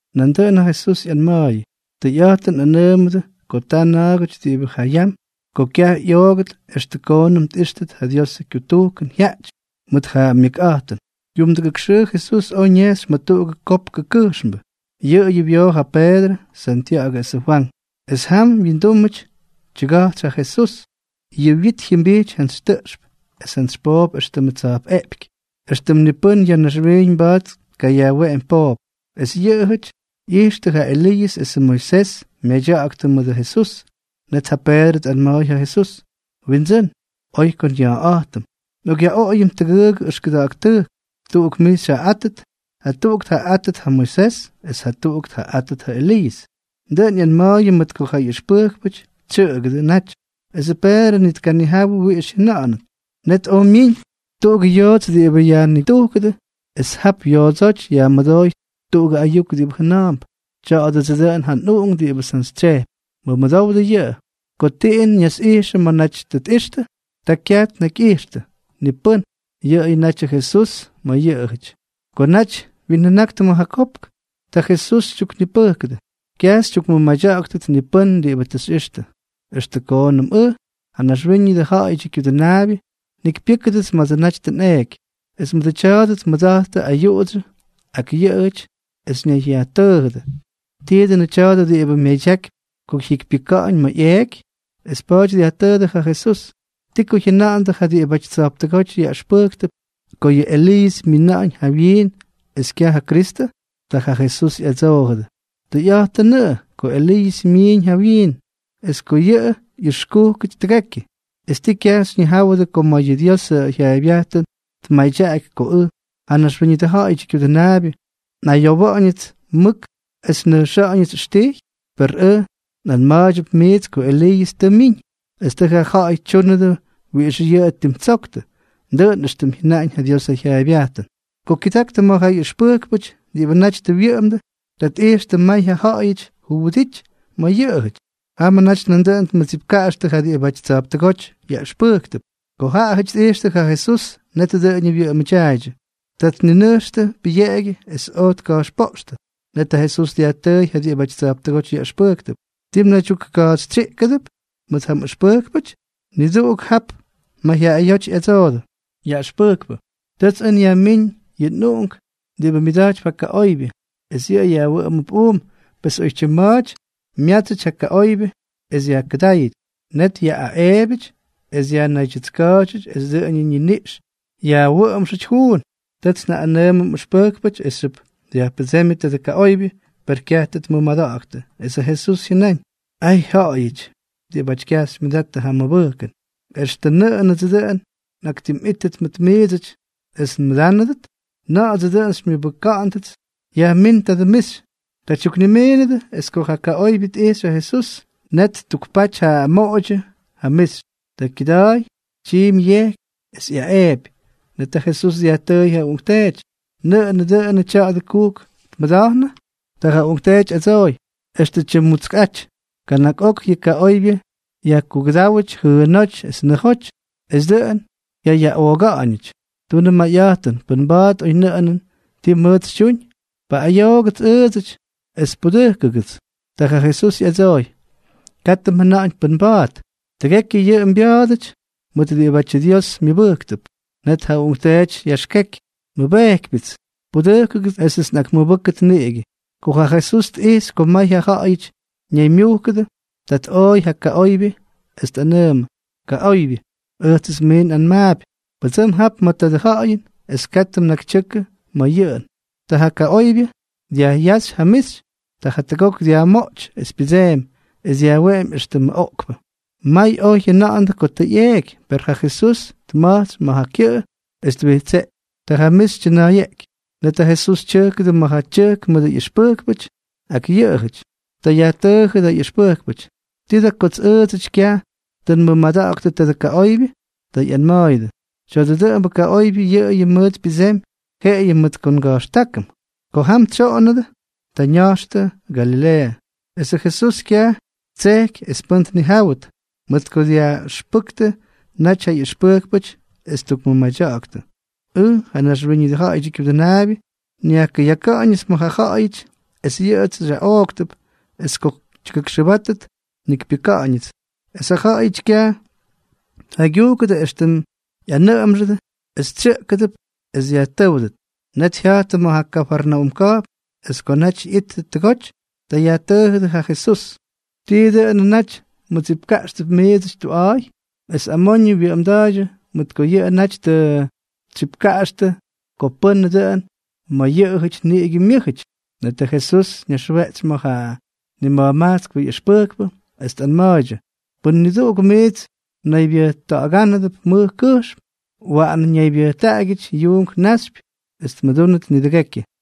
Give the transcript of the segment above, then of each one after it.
Nandʉꞌʉn ja Jesús ꞌyama̱a̱yʉdʉ: —Tʉyꞌa̱jtʉn nꞌanʉʉmʉdʉ ko ta na̱a̱gʉty diꞌibʉ ja yam ko kyaj ꞌyooktʉt extʉ koonʉm tꞌíxtʉt ja Diosʉ kyutujkʉn jyaꞌty mʉt ja myʉkꞌa̱jtʉn. Kyumdʉdujk xʉʉ Jesús oj ñejxy ma̱ tuꞌugʉ kopkʉ kʉjxmbʉ. Yʉꞌʉyʉ wyoo ja Peedrʉ, Santya̱ꞌa̱gʉ esʉ Fwank. Es jam wyindúmʉty tyʉga̱jtsy ja Jesús. Yʉ wyit jyʉmbijty jantsy tʉꞌxp es jantsy poop éxtʉmʉ tsa̱jpꞌeꞌpyky, éxtʉm ni pʉ́n ya̱ naxwiiñ mba̱a̱t tkayajweꞌemy poop. Es yʉꞌʉjʉty ꞌyijxtʉ ja Eliiʉs esʉ Moisés myadya̱ꞌa̱ktʉ mʉdʉ Jesús. Net ja Peedrʉ tꞌanma̱a̱y ja Jesús: —Windsʉ́n, oy ko nya̱a̱ꞌa̱jtʉm. Nꞌokꞌyaꞌoꞌoyʉm tʉgʉʉgʉ ʉxkʉda̱ꞌa̱k tʉjk: tuꞌuk mij xyjaꞌaꞌátʉt, jatuꞌuk tjaꞌaꞌátʉt ja Moisés es jatuꞌuk tjaꞌaꞌátʉt ja Eliiʉs. Dʉꞌʉn ꞌyanma̱a̱y mʉt ko ja ꞌyʉxpʉjkpʉty tsyʉꞌʉgʉdʉ naty, esʉ Peedrʉ ni tkanijawʉ wiꞌix jyʉna̱ꞌa̱nʉt. Net oj myiñ tuꞌugʉ yoots diꞌibʉ yajnitujkʉdʉ, es jap yoodsóty yajmʉdooy tuꞌugʉ ayuk diꞌibʉ jʉna̱a̱mp: —Tya̱a̱dʉdsʉ dʉꞌʉn ja nꞌUꞌunk diꞌibʉts njantsytsyejpy. Mʉmʉdowdʉ yʉꞌʉ. Ko tiꞌin ñasꞌijxʉdʉ ma̱ naty tʉ tꞌixtʉ, ta kyaj tnakyꞌijxtʉ ni pʉ́n, yʉꞌʉyʉ natyʉ Jesús ma̱ yʉꞌʉjʉty. Ko naty wyinjʉnaktʉ ma̱ ja kopk, ta Jesús tyuknipʉjkʉdʉ: —Kyaj xytyukmʉmadya̱ꞌa̱ktʉt ni pʉ́n diꞌibʉ tʉ xyꞌixtʉ, extʉ koonʉm ʉj, ja Naxwíñʉdʉ Ja̱ꞌa̱yʉdyʉ Kyudʉnaabyʉ, njikypyʉ́kʉdʉts ma̱dsʉ naty tʉ nꞌeeky. Es mʉdʉ tya̱a̱dʉ tmʉda̱jttʉ ayuꞌudsyʉ ak yʉꞌʉjʉty, es ñayyajtʉʉjʉdʉ: —¿Tii dʉnʉ tya̱a̱dʉ diꞌibʉ myadyakypy ko jyikypyʉka̱ꞌa̱ñ ma̱ ꞌyeꞌky? Es pa̱a̱ty dyajtʉʉdʉ ja Jesús: —¿Ti ko jyʉna̱ꞌa̱ndʉ ja diꞌibʉty tsa̱jptʉgóty yaꞌʉxpʉjktʉp ko yʉ Eliiʉs myina̱ꞌa̱ñ jawyiin es kyaj ja Kristʉ? Ta ja Jesús ꞌyadsoojʉdʉ: —Tʉyꞌa̱jtʉnʉꞌʉ ko Eliiʉs myiñ jawyiin, es ko yʉꞌʉ ꞌyʉxkúkʉty tʉgekyʉ. ¿Es tii, kyaj xyñijáwʉdʉ ko ma̱ yʉ Diosʉ jyaaybyajtʉn tmadyaꞌaky ko ʉj, ja Naxwíñʉdʉ Ja̱ꞌa̱yʉdyʉ Kyudʉnaabyʉ, nꞌayowa̱ꞌa̱ñʉts mʉk es nnʉjxa̱ꞌa̱ñʉts ʉxtijy? Per ʉj nꞌanma̱a̱ydyʉp miits ko Eliiʉs tʉ myiñ, es tʉ ja ja̱ꞌa̱y tyúnʉdʉ wiꞌix yʉꞌʉ ttimtsoktʉ, dʉꞌʉn éxtʉm jyʉnaꞌañ ja Diosʉ jyaaybyajtʉn. Ko kyʉdaktʉ ma̱ ja ꞌyʉxpʉjkpʉty diꞌibʉ naty tʉ wyʉꞌʉmdʉ, ta tꞌijxtʉ may ja ja̱ꞌa̱yʉty juwʉdity ma̱ yʉꞌʉjʉty. Jamʉ naty nandʉꞌʉn tmʉttsipka̱jxtʉ ja diꞌibʉty tsa̱jptʉgóty yaꞌʉxpʉjktʉp. Ko ja ja̱ꞌa̱yʉty tꞌijxtʉ ja Jesús, net dʉꞌʉñʉ wyʉꞌʉmʉdyaaydyʉ. Ta tninʉjxtʉ pʉyeꞌegyʉ es oj tka̱jxpoꞌxtʉ. Net ja Jesús dyajtʉʉy ja diꞌibʉty tsa̱jptʉgóty yaꞌʉxpʉjktʉp: —¿Ti mnaydyukkajxytsyíkʉdʉp mʉt ja nꞌʉxpʉjkpʉty? Niduꞌuk jap mayjyaꞌayóty ꞌyadsoodʉ: —Yaꞌʉxpʉjkpʉ, tʉts ʉj nyajmíñ yʉ nꞌuꞌunk diꞌibʉ myʉda̱jtypy ja kaꞌoybyʉ, es yʉꞌʉ yajwʉꞌʉmʉp uum. Pes oytyim ma̱a̱ty myátsyʉty ja kaꞌoybyʉ es yajkʉdáyʉty. Net yaꞌꞌaꞌeebyʉty, es yajnaydyʉtska̱a̱dyʉty es dʉꞌʉnʉ ñiniꞌx yajwʉꞌʉmxʉty juun. Tʉts njaꞌꞌanʉʉmʉ mꞌʉxpʉjkpʉty esxyʉp dyajpʉdsémyʉ tadʉ kaꞌoybyʉ, per kyaj tʉ tmʉmada̱ꞌa̱ktʉ. Es ja Jesús jyʉnáñ: —¡Ay, ja̱ꞌa̱yʉty diꞌibáty kyaj xymyʉdattʉ ja mʉbʉjkʉn! ¿Extʉ nʉꞌʉnʉdsʉ dʉꞌʉn nꞌaktimꞌítʉt mʉt miidsʉty es nmʉdánʉdʉt? ¿Na̱ꞌa̱dsʉ dʉꞌʉn xymyʉbʉka̱ꞌa̱ndʉts? Yajmín ja mixy. Ta tyuknimiinʉdʉ. Es ko ja kaꞌoybyʉ tꞌijxy ja Jesús, net ttukpaty ja moꞌodyʉ ja mixy. Ta kyʉda̱a̱y es tyiimy yejky es ꞌyaꞌeepy. Net ja Jesús dyajtʉʉy ja uꞌunkteety: —¿Nʉꞌʉnʉ dʉnʉ tya̱a̱dʉ kujk tmʉda̱jnʉ? Ta ja uꞌunkteety ꞌyadsooy: —Extʉ tyimmutskꞌa̱jty. Kana̱k ok yʉ kaꞌoybyʉ yajkukʉdáwʉty jʉʉnóty es nʉjoty, es dʉꞌʉn jyayaꞌooga̱ꞌa̱ñʉty. Tunʉ mayꞌa̱jtʉn, pʉn mba̱a̱t oynʉꞌʉnʉn ti mʉʉt xytyuñ, paꞌꞌayoodʉgʉts ʉʉdsʉty es pudʉjkʉdʉgʉts. Ta ja Jesús ꞌyadsooy: —¡Katʉ mjʉna̱ꞌa̱ñ pʉn mba̱a̱t! Tʉgekyʉ yʉꞌʉ mbya̱a̱dʉty mʉt diꞌibátyʉ Dios myʉbʉjktʉp. Net ja uꞌunkteety yaxkeky: —¡Nmʉbejkypyʉts! ¡Pudʉjkʉgʉts esʉts nꞌakmʉbʉ́kʉt niꞌigʉ! Ko ja Jesús tꞌijxy ko may ja ja̱ꞌa̱yʉty ñaymyujkʉdʉ, ta tꞌooy ja kaꞌoybyʉ es tꞌanʉʉmʉ: —Kaꞌoybyʉ, ʉjtsʉts mij nꞌanmaapy, pʉdsʉm jap ma̱ tadʉ ja̱ꞌa̱yʉn es katʉ mnakytyʉkʉ ma̱ yʉꞌʉn. Ta ja kaꞌoybyʉ dyajꞌyáxy ja mixy. Ta jatʉgok dyajmoꞌty es pyʉdseemy, es dyajweꞌemy éxtʉmʉ oꞌkpʉ. May oj jyʉna̱ꞌa̱ndʉ ko tʉ ꞌyeeky. Per ja Jesús tma̱jtsy ma̱ ja kyʉꞌʉ, es twijtseꞌky. Ta ja mixy tyʉna̱a̱yeꞌky. Net ja Jesús tyʉjkʉdʉ ma̱ ja tyʉjk mʉdʉ ꞌyʉxpʉjkpʉty ak yʉꞌʉyʉty. Ta yajtʉʉjʉdʉ ja ꞌyʉxpʉjkpʉty: —¿Tii da kots ʉʉdsʉty kyaj tʉ nmʉmada̱ꞌa̱ktʉ tadʉ kaꞌoybyʉ? Ta ꞌyanma̱a̱yʉdʉ: —Tya̱dʉ dʉꞌʉmbʉ kaꞌoybyʉ, yʉꞌʉyʉ mʉʉt pyʉdsemy jeꞌeyʉ mʉt ko nga̱jxtákʉm. Ko jam tsyoꞌondʉ, ta ña̱jxtʉ Galileeʉ. Esʉ Jesús kyaj ttsejky es pʉ́n tnijáwʉdʉt, mʉt ko dyaꞌʉxpʉktʉ naty ja ꞌyʉxpʉjkpʉty es ttukmʉmadya̱ꞌa̱ktʉ: —Ʉj, ja Naxwíñʉdʉ Ja̱ꞌa̱yʉdyʉ Kyudʉnaabyʉ, nyajkʉyaka̱ꞌa̱ñʉts ma̱ ja ja̱ꞌa̱yʉty, es yʉꞌʉts xyaꞌooktʉp, es ko tyʉgʉkxʉbátʉt, njikypyʉ́kʉdʉts. Es jaꞌajʉty kyaj tjaygyujkʉdʉ éxtʉm ꞌyanʉꞌʉmxʉdʉ, es tsyʉꞌkʉdʉp es dyajtʉ́wdʉt. Net jya̱jttʉ ma̱ ja Kafarnaúm ka̱jpn. Es ko naty ꞌyittʉ tʉgoty, ta yajtʉʉjʉdʉ ja Jesús: —¿Tii dʉꞌʉn naty mdsipka̱jxtʉp miidsʉty tuꞌa̱a̱y? Es amoñʉ wyʉꞌʉmda̱a̱ydyʉ, mʉt ko yʉꞌʉ naty tʉ ttsipka̱jxtʉ ko pʉ́nʉ dʉꞌʉn ma̱ yʉꞌʉjʉty niꞌigʉ myʉ́jʉty. Netʉ Jesús ñaxweꞌtsy ma̱ ja nima̱jmajtskpʉ ꞌyʉxpʉjkpʉ, es tꞌanma̱a̱ydyʉ: —Pʉn niduꞌuk miits mnaybyʉjta̱ꞌa̱gánʉdʉp mʉj kʉjxm, waꞌan ñaybyʉjtaꞌagyʉty yuunk naxypyʉ, es tmʉdúnʉt nidʉgekyʉ.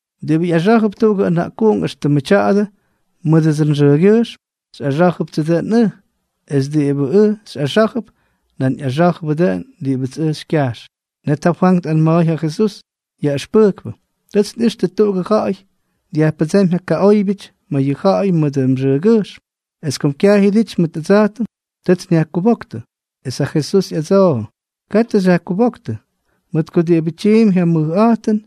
—Diꞌibʉ ꞌyaxá̱jʉp tuꞌugʉ ʉna̱ꞌkuꞌunk éxtʉmʉ tya̱a̱dʉ mʉdʉdsʉ nxʉʉgyʉjxm, xyꞌaxá̱jʉptsʉ dʉꞌʉn ʉj; es diꞌibʉts ʉj xyꞌaxá̱jʉp, nan ꞌyaxá̱jʉbʉ dʉꞌʉn diꞌibʉts ʉj xykyajx. Net ja Fwank tꞌanma̱a̱y ja Jesús: —Yaꞌʉxpʉjkpʉ, tʉts nꞌixtʉ tuꞌugʉ ja̱ꞌa̱y dyajpʉdsémy ja kaꞌóybyʉty ma̱ yʉ ja̱ꞌa̱y mʉdʉ mxʉʉgyʉjxm, es kom kyaj jyʉdity mʉt ʉdsa̱jtʉm, tʉts nyajkubóktʉ. Es ja Jesús ꞌyadsoojʉ: —Katʉ xyajkubóktʉ, mʉt ko diꞌibʉ tyiimpy ja mʉjꞌa̱jtʉn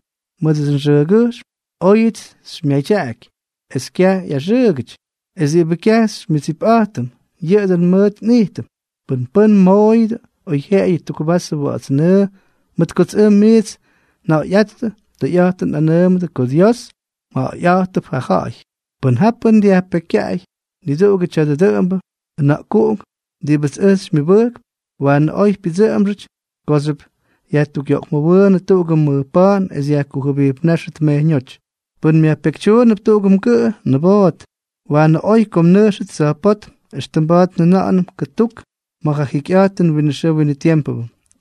mʉdʉts nxʉʉgyʉjxm, óyʉts xymyadyaꞌaky es kyaj ꞌyaxʉʉgʉty. Es diꞌibʉ kyaj xymyʉdsipꞌa̱jtʉm, yʉꞌʉ dʉn mʉt nꞌijtʉm. Pʉn pʉ́n mmoꞌoyʉdʉ oyjyeꞌeyʉ tuk vasʉ wa̱ꞌa̱ts nʉʉ mʉt kots ʉj miits nja̱ꞌa̱yꞌáttʉ, tʉyꞌa̱jtʉn nꞌanʉʉmʉdʉ ko Dios myayꞌátʉp ja ja̱ꞌa̱y. ’Pʉn ja pʉ́n dyajpekykyaꞌay niduꞌugʉ tya̱dʉ dʉꞌʉmbʉ ʉna̱ꞌkuꞌunk diꞌibʉts ʉj xymyʉbʉjkp, waanʉ oy pyʉdsʉꞌʉmxʉty kooxyʉp yajtukꞌyoꞌkmʉwʉʉnʉ tuꞌugʉ mʉj pa̱a̱n es yajkujʉbijpnáxʉt mejyñóty. Pʉn myajpekytyuunʉp tuꞌugʉ mgʉꞌʉ, niboot. Waanʉ oy ko mnʉjxʉt tsa̱jpótm, éxtʉm mba̱a̱t njʉna̱ꞌa̱nʉm kʉtuk ma̱ ja jikyꞌa̱jtʉn winʉ xʉʉ winʉ tiempʉ,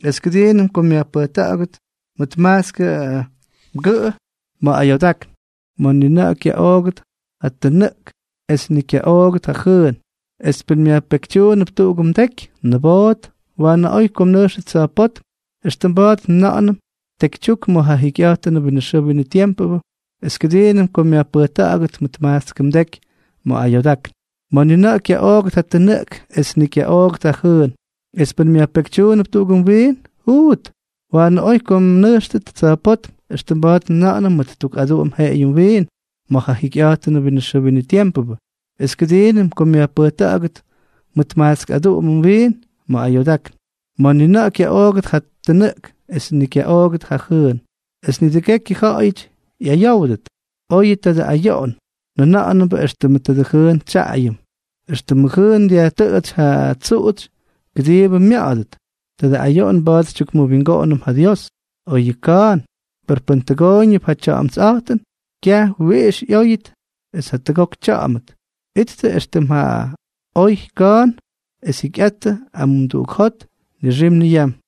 es kʉdiinʉm ko myajpʉjta̱ꞌa̱gʉt mʉt majtskʉ mgʉꞌʉ ma̱ ayoodákn, ma̱ ni na̱ꞌa̱ kyaꞌoogʉt ja tʉnʉꞌk es ni kyaꞌoogʉt ja jʉʉn. Es pʉn myajpekytyuunʉp tuꞌugʉ mdeky, niboot. Waanʉ oy ko mnʉjxʉt tsa̱jpótm, éxtʉm mba̱a̱t njʉna̱ꞌa̱nʉm, tekytyuk ma̱ ja jikyꞌa̱jtʉn winʉ xʉʉ winʉ tiempʉ es kʉdiinʉm ko myajpʉjta̱ꞌa̱gʉt mʉt majtskʉ mdeky ma̱ ayoodákn, ma̱ ni na̱ꞌa̱ kyaꞌoogʉt ja tʉnʉꞌk es ni kyaꞌoogʉt ja jʉʉn. Es pʉn myajpekytyuunʉp tuꞌugʉ mwiin, juut. Waanʉ oy ko mnʉjxʉt tsa̱jpótm, éxtʉm mba̱a̱t njʉna̱ꞌa̱nʉm, mʉt tuk aduꞌum jeꞌeyʉ mwiin ma̱ ja jikyꞌa̱jtʉn winʉ xʉʉ winʉ tiempʉ es kʉdiinʉm ko myajpʉjta̱ꞌa̱gʉt mʉt majtskʉ mwiin ma̱ ayoodákn, ma̱ ni na̱ꞌa̱ kyaꞌoogʉt ja tʉnʉꞌk es ni kyaꞌoogʉt ja jʉʉn. ’Es nidʉgekyʉ ja̱ꞌa̱yʉty ꞌyayówdʉt, oyʉ tadʉ ayoꞌon njaja̱ꞌa̱mbʉ éxtʉmʉ jʉʉn xytsyaꞌayʉm. Extʉmʉ jʉʉn dyajtʉꞌʉtsy ja tsuꞌutsy kʉdiibʉ mya̱ꞌa̱dʉt, tadʉ ayoꞌon mba̱a̱t xytyukmʉwingoꞌonʉm ja Dios. Oy yʉ ka̱a̱n. Per pʉn tʉgooyñʉp ja tya̱ꞌa̱mtsꞌa̱jtʉn, kyaj wiꞌix ꞌyóyʉt es jatʉgok tya̱ꞌa̱mʉt. Ittʉ éxtʉm ja oy ka̱a̱n es jikyꞌattʉ amumduꞌuk jot nixim niyam.